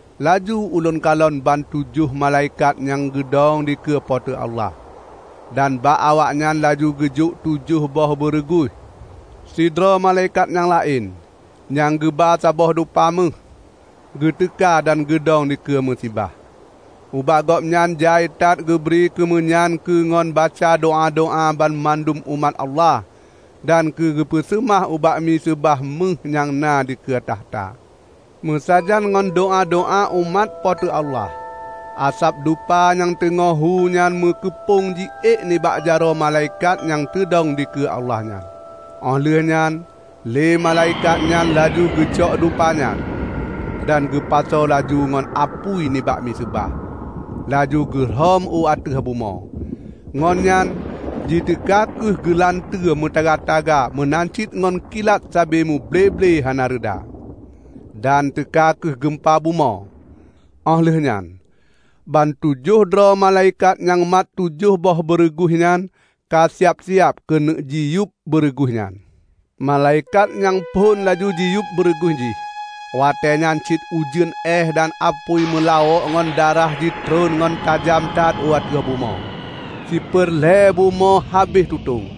Laju ulôn kalon bantujoh malaikat nyang geudong dikeue Po teu Allah, dan bak awaknyan laju geujok tujoh boh beureuguih. Sidroe malaikat nyang laén, nyang geuba saboh dupa méuh, geuteuka dan geudong dikeue miseubah. Ubak gobnyan jai that geubri keumeunyan keu ngon baca doá-doá banmandum umat Allah dan keugeupeuseumah ubak miseubah méuh nyang na dikeue takhta. Meusajan ngon doá-doá umat Po teu Allah, asab dupa nyang teungoh hu nyan meukeupong jiék nibak jaroe malaikat nyang teudong dikeue Allah nyan. Óh lheueh nyan lé malaikat nyan laju geucok dupa nyan, dan geupasoe laju ngon apui nibak miseubah, laju geurhom u ateueh bumoe. Ngon nyan jiteuka kheueh geulanteue meutaga-taga meunan cit ngon kilat sabe muble-ble hana reuda, dan teuka kheueh geumpa bumoe. Óh lheueh nyan, bantujoh droe malaikat nyang mat tujoh boh beureuguih nyan ka siab-siab keuneuk jiyueb beureuguih nyan. Malaikat nyang phon laju jiyueb beureuguih jih, watée nyan cit ujeuen éeh dan apui meulawok ngon darah jitreun ngon tajam that u ateueh bumoe. Siper lhée bumoe habéh tutong;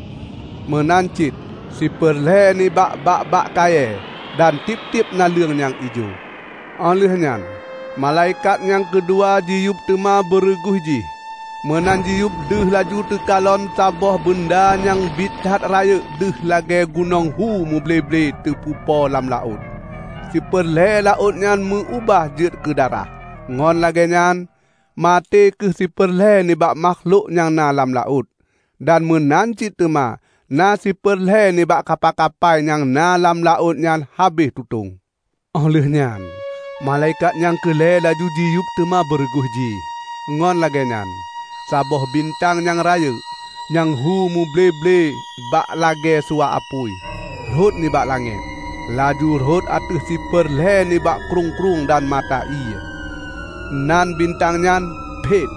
meunan cit siper lhée nibak bak-bak kayée, dan tieb-tieb naleueng nyang ijo. Óh lheueh nyan malaikat nyang keudua jiyueb teuma beureuguih jih, meunan jiyueb deuh laju teukalon saboh beunda nyang biet that rayeuk deuh lagée gunong hu muble-ble teupeupo lam laôt. Siper lhée laôt nyan meu-ubah jeuet keudarah, ngon lagée nyan maté kheueh siper lhée nibak makhlok nyang na lam laôt; dan meunan cit teuma na siper lhée nibak kapai-kapai nyang na lam laôt nyan habéh tutong. Óh lheueh nyan malaikat nyang keu lhée laju jiyueb teuma beureuguih jih, ngon lagée nyan saboh bintang nyang rayeuk, nyang hu muble-ble bak lagée suwa apui, rhot nibak langét, laju rhot ateueh siper lhée nibak krueng-krueng dan mata ié. (Nan bintang nyan "Phet".)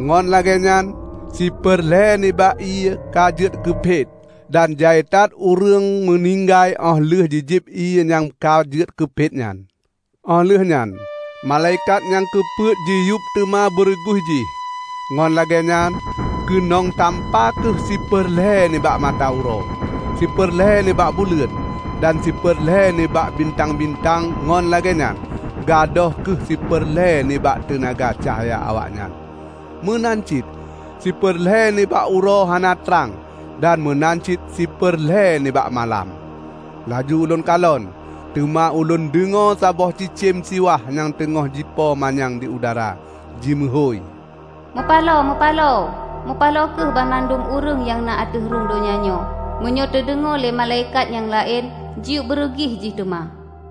Ngon lagée nyan siper lhée nibak ié ka jeuet keu phet, dan jai that ureuëng meuninggai óh lheueh jijieb ié nyang ka jeuet keu phet nyan. Óh lheueh nyan malaikat nyang keu peuet jiyueb teuma beureuguih jih. Ngon lagée nyan, keunong tampa kheueh siper lhée nibak mata uroe, siper lhée nibak buleuen, dan siper lhée nibak bintang-bintang ngon lagée nyan gadôh kheueh siper lhée nibak teunaga cahya awaknyan. Meunan cit siper lhée nibak uroe hana trang dan meunan cit siper lhée nibak malam. Laju ulôn kalon, teuma ulôn deungoe saboh cicém siwah nyang teungoh jipo manyang di udara, jimeuhôi, "Mupaloe! Mupaloe! Mupaloe kheueh banmandum ureuëng nyang na ateueh rhueng donya nyoe meunyoe teudeungoe lhée malaikat nyang laén jiyueb beureuguih jih teuma!"